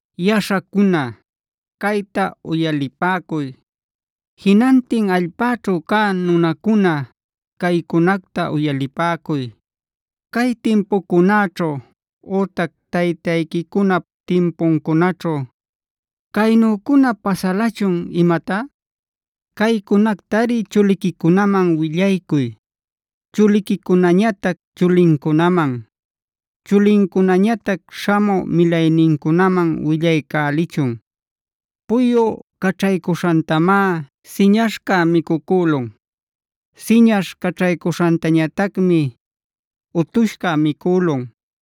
“Yaśhacuna, cayta uyalipäcuy. Jinantin allpäćhu cä nunacuna, caycunacta uyalipäcuy: ¿Cay timpucunaćhu ütac taytayquicunap timpuncunaćhu caynücuna pasalachun imatá? Caycunactari chuliquicunaman willaycuy, chuliquicunañatac chulincunaman, chulincunañatac śhamü milaynincunaman willaycälichun. Puyu caćhaycuśhantamá siñaśhca micucülun. Siñaśh caćhaycuśhantañatacmi utushca micülun.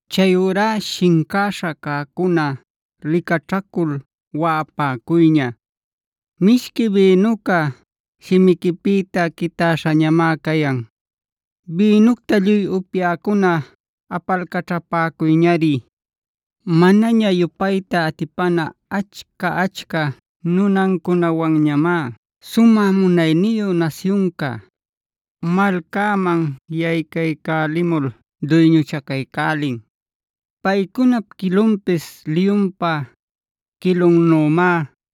“Chayurá shincäśha cäcuna licaćhacul waꞌapäcuyña. Mishqui bïnuca shimiquipïta quitäśhañamá cayan. Bïnucta lluy upyäcuna apalcaćhapäcuyñari. Manaña yupayta atipana achca-achca nunancunawanñamá sumä munayniyu nasyunca, malcäman yaycaycälimul duyñuchacaycälin. Paycunap quilunpis liyunpa quilunnümá;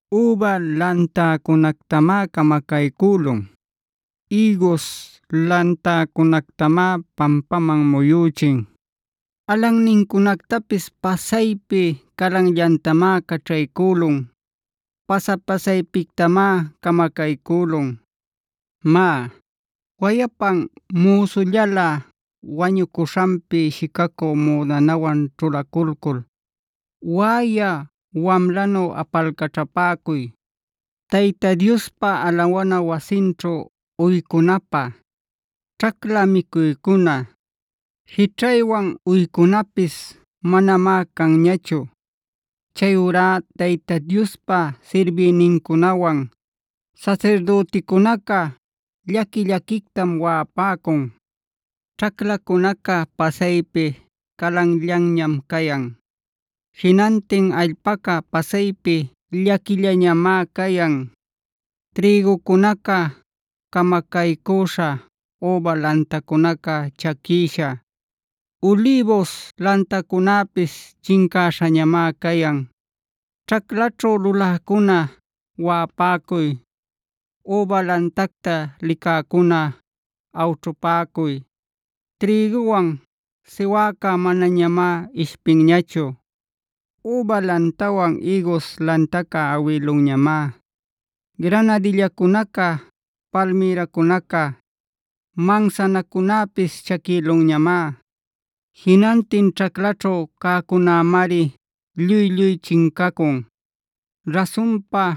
Üba lantäcunactamá camacaycülun; ïgus lantäcunactamá pampaman muyüchin. Alannincunactapis pasaypi calanllantamá caćhaycülun. Pasa-pasaypictamá camacaycülun. “Má, wayapan müsullalä wañucuśhanpi shicacü müdanawan ćhulaculcul waꞌayä wamlanu apalcaćhapäcuy. Tayta Diospa alawana wasinćhu uycunapä, ćhacla micuycuna, jićhaywan uycunapis manamá canñachu. Chayurá Tayta Diospa sirbïnincunawan sasirdüticunaca llaqui-llaquictam waꞌapäcun. Ćhaclacunaca pasaypi calanllanñam cayan. Jinantin allpaca pasaypi llaquillañamá cayan. Trïgucunaca camacaycüśha, üba lantacunaca chaquïsha, ulïbus lantacunäpis chincäśhañamá cayan. “Ćhaclaćhu luläcuna, waꞌapäcuy. Üba lantacta licäcuna, awćhupäcuy. Trïguwan siwäca manañamá ishpinñachu. Üba lantawan ïgus lantaca awïlunñamá. Granadillacunaca, palmïracunaca, mansanacunäpis chaquïlunñamá. Jinantin ćhaclaćhu cäcunämari lluy-lluy chincacun. Rasunpa,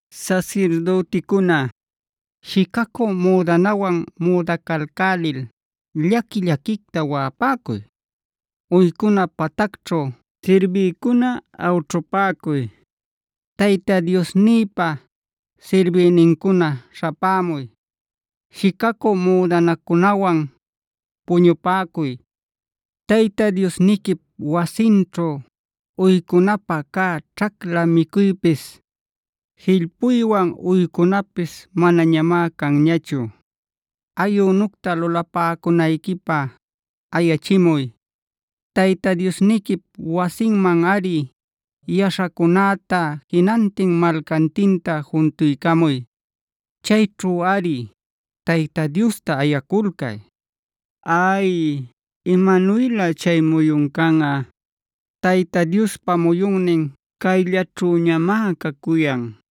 “Sasirdüticuna, shicacü müdanawan müdacalcälil llaqui-llaquicta waꞌapäcuy. Uycuna patacćhu sirbïcuna awćhupäcuy. Tayta Diosnïpa sirbïnincuna śhapämuy; shicacü müdanacunawan puñupäcuy. Tayta Diosniquip wasinćhu uycunapä cä ćhacla micuypis, jillpuywan uycunapis manañamá canñachu. Ayünucta lulapäcunayquipä ayachimuy. Tayta Diosniquip wasinmanꞌari yaśhacunäta, jinantin malcantinta juntuycamuy. Chayćhuꞌari Tayta Diosta ayaculcay. “¡Ay, imanuylä chay muyun canꞌa! Tayta Diospa muyunnin cayllaćhüñamá cacuyan.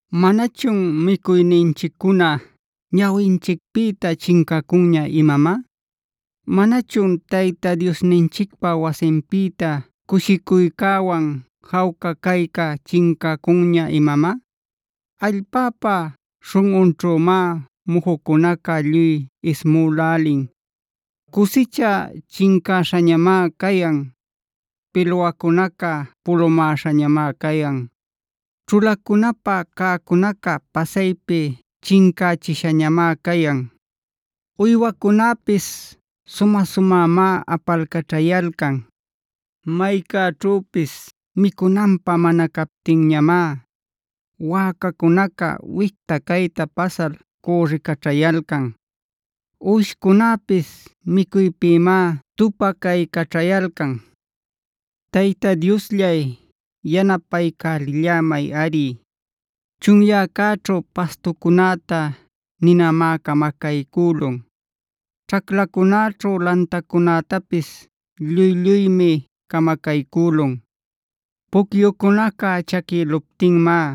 “¿Manachun micuyninchiccuna ñawinchicpïta chincacunña imamá? ¿Manachun Tayta Diosninchicpa wasinpïta cushicuycäwan jawca cayca chincacunña imamá? Allpäpa śhunꞌunćhümá mujucunaca lluy ismülälin. Cusicha chincäśhañamá cayan; pilwacunaca pulumäśhañamá cayan. Ćhulacunapä cäcunaca pasaypi chincächishañamá cayan. Uywacunäpis sumä-sumämá apalcaćhayalcan. Maycäćhüpis micunanpä mana captinñamá wäcacunaca wicta cayta pasal cürricaćhayalcan. Uwishcunäpis micuypïmá tupacaycaćhayalcan. “Tayta Diosllay, yanapaycälillämayꞌari. Chunyäcäćhu pastucunäta ninamá camacaycülun. Ćhaclacunäćhu lantacunätapis lluy-lluymi camacaycülun. Pucyucunaca chaquïluptinmá,